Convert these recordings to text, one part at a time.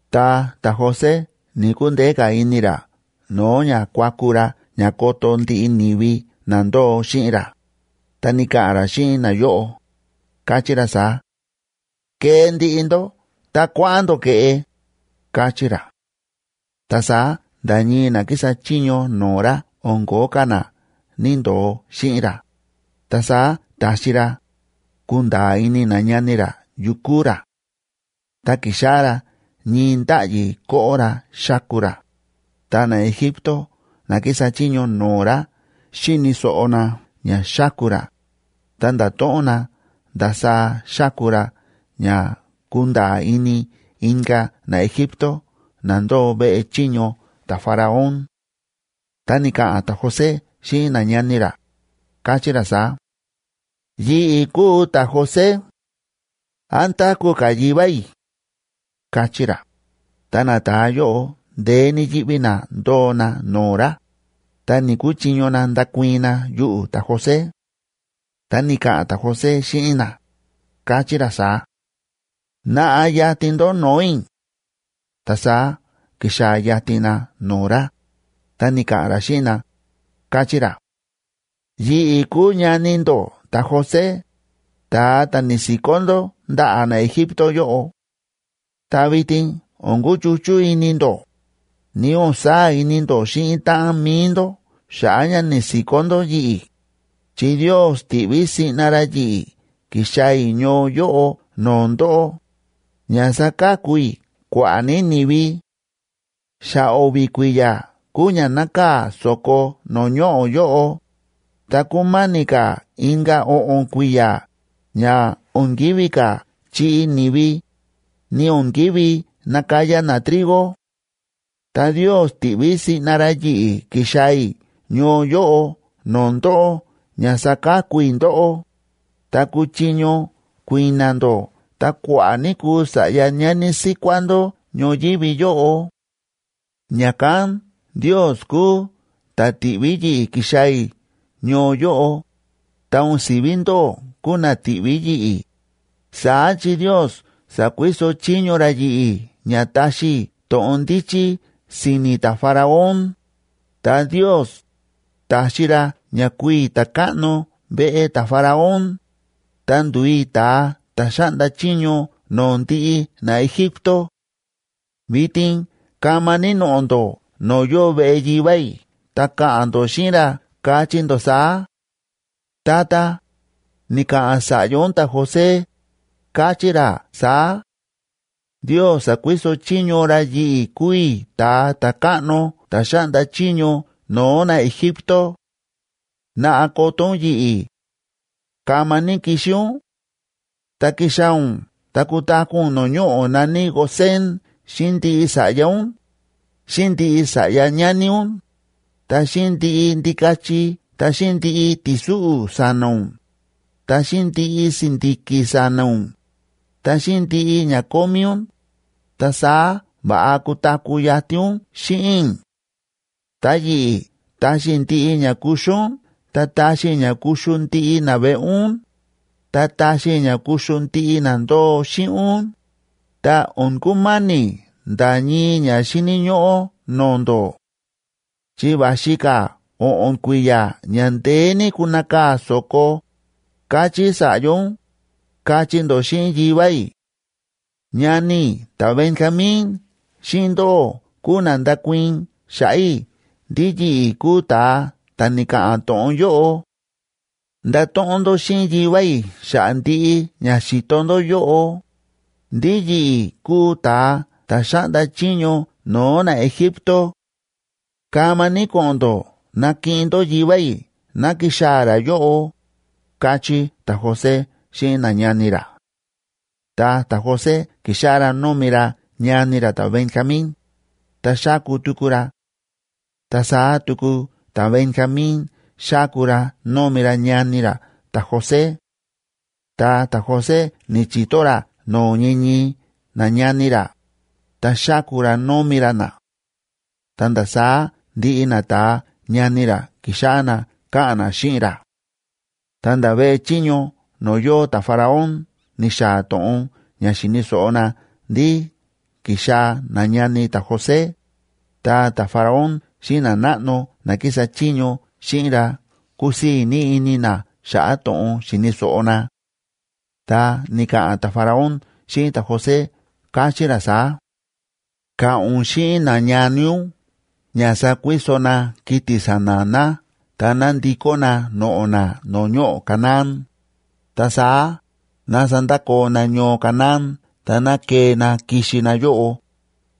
Ta ta̱José ni̱‑kundeé ka̱ ini ra no̱o̱ ña kuaku ra ña koto ndiꞌi ni̱vi na ndóo xíꞌin ra, ta ni̱ka̱ꞌa̱n ra xíꞌin nayóꞌo, káchí ra saá: ―¡Kee ndiꞌi ndó ta kuáꞌa̱n ndó ke̱ꞌe! ―káchí ra. Ta saá nda̱ ñii na kísa chiño no̱o̱ ra o̱n ko̱ó ka̱ na ni̱‑ndoo xíꞌin ra, ta saá ta̱xi ra ku̱nda̱a̱ ini nañani ra yu kúu ra. Ta ki̱xáꞌá ra ñii ndáꞌyi koꞌo ra xáku ra, ta naEgipto na kísa chiño no̱o̱ ra xíni̱ so̱ꞌo na ña xáku ra, ta nda̱to̱ꞌon na ndasaá xáku ra ña kúnda̱a̱ ini inka̱ naEgipto na ndóo veꞌe chiño ta̱Faraón. Ta ni̱ka̱ꞌa̱n ta̱José xíꞌin nañani ra, káchí ra saá: ―¡Yi̱ꞌi̱ kúu ta̱José! ¿Án táku̱ ka̱ yivá i̱? ―káchí ra. Ta nata̱a yóꞌo ndeé ní yíꞌví na ndóo na no̱o̱ ra, ta ni̱‑kuchiño na ndakuii̱n na yuꞌu̱ ta̱José. Ta ni̱ka̱ꞌa̱n ta̱José xíꞌin na, káchí ra saá: ―Naꞌa yatin ndó no̱o̱ i̱. Ta saá ki̱xaa̱ yatin na no̱o̱ ra, ta ni̱ka̱ꞌa̱n ra xíꞌin na, káchí ra: ―Yi̱ꞌi̱ kúu ñani ndó ta̱José, ta̱a ta̱ ni̱si̱kó ndó ndaꞌa̱ naEgipto yóꞌo; ta vitin o̱n kuchuchú ini ndó, ni o̱n saa̱ ini ndó xíꞌin táꞌan mi̱i ndó xa̱ꞌa̱ ña ni̱si̱kó ndó yi̱ꞌi̱, chi Ndios ti̱ꞌví siꞌna ra yi̱ꞌi̱ ki̱xaa̱ i̱ ñoo yóꞌo no̱o̱ ndóꞌó, ña saka̱ku i̱ kua̱ꞌa̱ ní ni̱vi. Xa o̱vi̱ kui̱ya̱ kúu ña nákaa̱ so̱ko no̱o̱ ñoꞌo̱ yóꞌo, ta kúmáni̱ ka̱ inka̱ o̱ꞌo̱n kui̱ya̱ ña o̱n kívi ka̱ chiꞌi ni̱vi, ni o̱n kívi nakaya na trigo. Ta Ndios ti̱ꞌví siꞌna ra yi̱ꞌi̱ ki̱xaa̱ i̱ ñoo yóꞌo no̱o̱ ndóꞌó ña saka̱ku i̱ ndóꞌó, ta kuchiño kui̱na̱ ndó ta kua̱ꞌa̱ ní kuu sa̱ꞌya ñani síkuá ndó ñoyívi yóꞌo. Ña̱kán Ndios kúu ta̱ ti̱ꞌví yi̱ꞌi̱ ki̱xaa̱ i̱ ñoo yóꞌo, ta o̱n si̱ví ndóꞌó kúu na ti̱ꞌví yi̱ꞌi̱, saá chi Ndios sa̱kuiso chiño ra yi̱ꞌi̱ ña taxi i̱ to̱ꞌon ndíchí si̱ni̱ ta̱Faraón, ta Ndios ta̱xi ra ña kúu i̱ ta̱káꞌno veꞌe ta̱Faraón, ta ndu̱u i̱ ta̱a ta̱ xáꞌnda chiño no̱o̱ ndiꞌi naEgipto. Vitin kama ní noꞌo̱ ndó no̱o̱ yóo veꞌe yivá i̱ ta ka̱ꞌa̱n ndó xíꞌin ra, kachí ndó saá: “Tata, ni̱ka̱ꞌa̱n sa̱ꞌya ún ta̱José, káchí ra saá: Ndios sa̱kuiso chiño ra yi̱ꞌi̱ kúu i̱ ta̱a ta̱káꞌno ta̱ xáꞌnda chiño no̱o̱ naEgipto. Naꞌa koto ún yi̱ꞌi̱. Kama ní kixi ún. Tá kixaa̱ ún ta kutaku̱ ún no̱o̱ ñoꞌo̱ na̱ní Gosén xíꞌin ndiꞌi sa̱ꞌya ún, xíꞌin ndiꞌi sa̱ꞌya ñani ún, ta xíꞌin ndiꞌi ndikachi ta xíꞌin ndiꞌi ti̱súꞌu̱ sa̱na̱ ún, ta xíꞌin ndiꞌi si̱ndi̱ki̱ sa̱na̱ ún, ta xíꞌin ndiꞌi ña kómí ún, ta saá va̱ꞌa kutaku̱ yatin ún xíꞌin i̱. Ta yi̱ꞌi̱, taxi i̱ ndiꞌi ña kuxu ún ta taxi i̱ ña kuxu ndiꞌi naveꞌe ún, ta taxi i̱ ña kuxu ndiꞌi na ndóo xíꞌin ún, ta o̱n kumáni̱ nda̱ ñii ña xíni̱ ñóꞌó no̱o̱ ndó; chi va̱xi ka̱ o̱ꞌo̱n kui̱ya̱ ña ndeé ní kunakaa̱ so̱ko, káchí sa̱ꞌya ún”, kachí ndó xíꞌin yivá i̱. Ñani i̱ ta̱Benjamín xíꞌin ndóꞌó kúu na ndakuii̱n xa̱ꞌa̱ i̱ ndí yi̱ꞌi̱ kúu ta̱a ta̱ ni̱ka̱ꞌa̱n to̱ꞌon yóꞌo. Ndato̱ꞌon ndó xíꞌin yivá i̱ xa̱ꞌa̱ ndiꞌi ña xi̱to ndó yóꞌo, ndí yi̱ꞌi̱ kúu ta̱a ta̱ xáꞌnda chiño no̱o̱ naEgipto. Kama ní ko̱ꞌo̱n ndó nakiꞌin ndó yivá i̱ ná kixaa̱ ra yóꞌo ―káchí ta̱José xíꞌin nañani ra. Ta ta̱José ki̱xáꞌá ra nómi ra ñani ra ta̱Benjamín, ta xáku tuku ra. Ta saá tuku ta̱Benjamín xáku ra nómi ra ñani ra ta̱José. Ta ta̱José ni̱chi̱to ra no̱o̱ ñii ñii nañani ra, ta xáku ra nómi ra na. Ta nda̱ saá ndiꞌi nata̱a ñani ra ki̱xáꞌá na káꞌa̱n na xíꞌin ra. Ta nda̱ veꞌe chiño no̱o̱ yóo ta̱Faraón ni̱xaa̱ to̱ꞌon ña xi̱ni̱ so̱ꞌo na ndí ki̱xaa̱ nañani ta̱José, ta ta̱Faraón xíꞌin nanáꞌno na kísa chiño xíꞌin ra kúsii̱ ní ini na xa̱ꞌa̱ to̱ꞌon xi̱ni̱ so̱ꞌo na. Ta ni̱ka̱ꞌa̱n ta̱Faraón xíꞌin ta̱José, káchí ra saá: ―Ka̱ꞌa̱n ún xíꞌin nañani ún ña sakuiso na kiti̱ sa̱na̱ na ta ná ndikó na noꞌo̱ na no̱o̱ ñoꞌo̱ Canaán, ta saá ná sandakoo na ñoo Canaán ta ná kee na kixi na yóꞌo,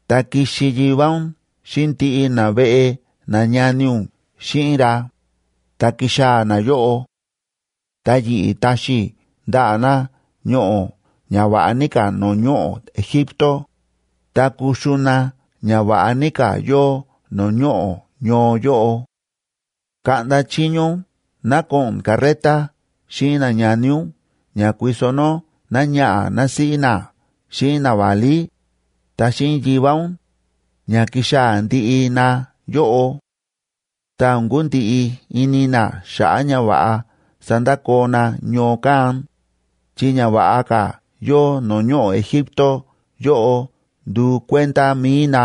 ta kixi yivá ún xíꞌin ndiꞌi naveꞌe nañani ún xíꞌin ra, ta kixaa̱ na yóꞌo. Ta yi̱ꞌi̱ taxi i̱ ndaꞌa̱ na ñoꞌo̱ ña va̱ꞌa ní ka̱ no̱o̱ ñoꞌo̱ Egipto, ta kuxu na ña va̱ꞌa ní ka̱ yóo no̱o̱ ñoꞌo̱ ñoo yóꞌo. Kaꞌnda chiño ún ná ko̱ꞌo̱n carreta xíꞌin nañani ún ña kuiso nó náñaꞌa̱ násíꞌí na xíꞌin naválí, ta xíꞌin yivá ún, ña kixaa̱ ndiꞌi na yóꞌo. Ta o̱n kundiꞌi ini na xa̱ꞌa̱ ñava̱ꞌa sandakoo na ñoo kán, chi ña va̱ꞌa ka̱ yóo no̱o̱ ñoꞌo̱ Egipto yóꞌo nduu kuenda mi̱i na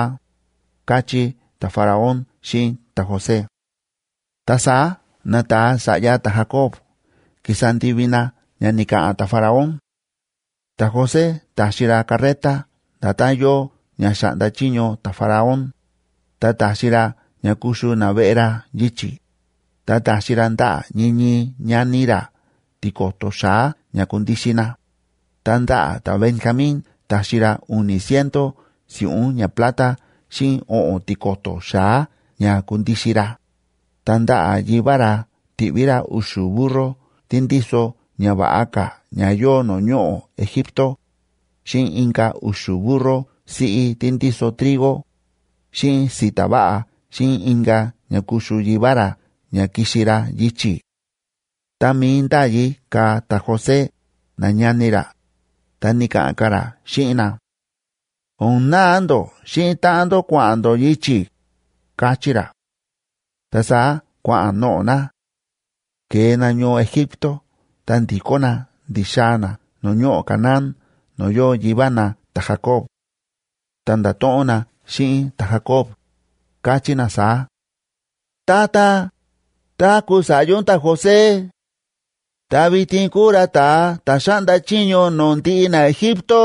―káchí ta̱Faraón xíꞌin ta̱José. Ta saá nata̱a sa̱ꞌya ta̱Jacoba ki̱sa ndivi na ña ni̱ka̱ꞌa̱n ta̱Faraón. Ta̱José ta̱xi ra carreta nda̱tán yóo ña xa̱ꞌnda chiño ta̱Faraón, ta ta̱xi ra ña kuxu naveꞌe ra yichi̱; ta ta̱xi ra ndaꞌa̱ ñii ñii ñani ra tiko̱to̱ xa̱á ña kundixin na, ta ndaꞌa̱ ta̱Benjamín ta̱xi ra u̱ni̱ ciento si̱ꞌún ñaplata xíꞌin o̱ꞌo̱n tiko̱to̱ xa̱á ña kundixin ra. Ta ndaꞌa̱ yivá ra ti̱ꞌví ra u̱xu̱ burro tí ndíso ña va̱ꞌa ka̱ ña yóo no̱o̱ ñoꞌo̱ Egipto, xíꞌin inka̱ u̱xu̱ burro siꞌí tí ndíso trigo xíꞌin si̱ta̱ va̱ꞌa xíꞌin inka̱ ña kuxu yivá ra ña kixi ra yichi̱. Tá mií ndáyi ka̱ ta̱José nañani ra, ta ni̱ka̱ꞌa̱n ka̱ ra xíꞌin na: ―O̱n naa ndó xíꞌin táꞌan ndó kua̱ꞌa̱n ndó yichi̱ ―káchí ra. Ta saá kua̱ꞌa̱n noꞌo̱ na. Ke̱e na ñoo Egipto ta ndi̱kó na ndi̱xaa̱ na no̱o̱ ñoꞌo̱ Canaán no̱o̱ yóo yivá na ta̱Jacob. Ta nda̱to̱ꞌon na xíꞌin ta̱Jacob, káchí na saá: ―¡Tata, táku̱ sa̱ꞌya ún ta̱José! ¡Ta vitin kúu ra ta̱a ta̱ xáꞌnda chiño no̱o̱ ndiꞌi naEgipto!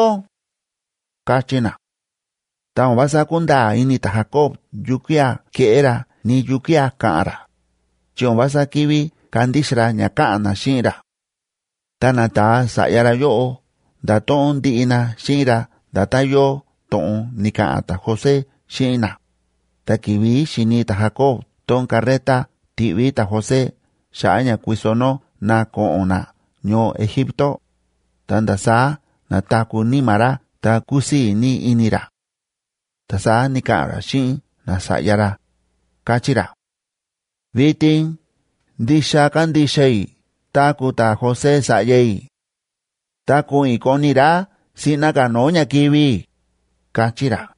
―káchí na. Ta o̱n vása kúnda̱a̱ ini ta̱Jacob yukía̱ keꞌé ra ni yukía̱ ka̱ꞌa̱n ra, chi o̱n vása ki̱ví kandixa ra ña káꞌa̱n na xíꞌin ra. Ta nata̱a sa̱ꞌya ra yóꞌo nda̱to̱ꞌon ndiꞌi na xíꞌin ra nda̱tán yóo to̱ꞌon ni̱ka̱ꞌa̱n ta̱José xíꞌin na, ta ki̱vi̱ xi̱ni ta̱Jacob tón carreta ti̱ꞌví ta̱José xa̱ꞌa̱ ña kuiso nó na ko̱ꞌo̱n na ñoo Egipto, ta nda̱ saá na̱taku̱ níma̱ ra ta kúsii̱ ní ini ra. Ta saá ni̱ka̱ꞌa̱n ra xíꞌin nasa̱ꞌya ra, káchí ra: ―Vitin ndixa kándixa i̱ táku̱ ta̱José sa̱ꞌya i̱. Ta ko̱ꞌo̱n i̱ koni i̱ ra siꞌna ka̱ no̱o̱ ña kivi̱ i̱ ―káchí ra.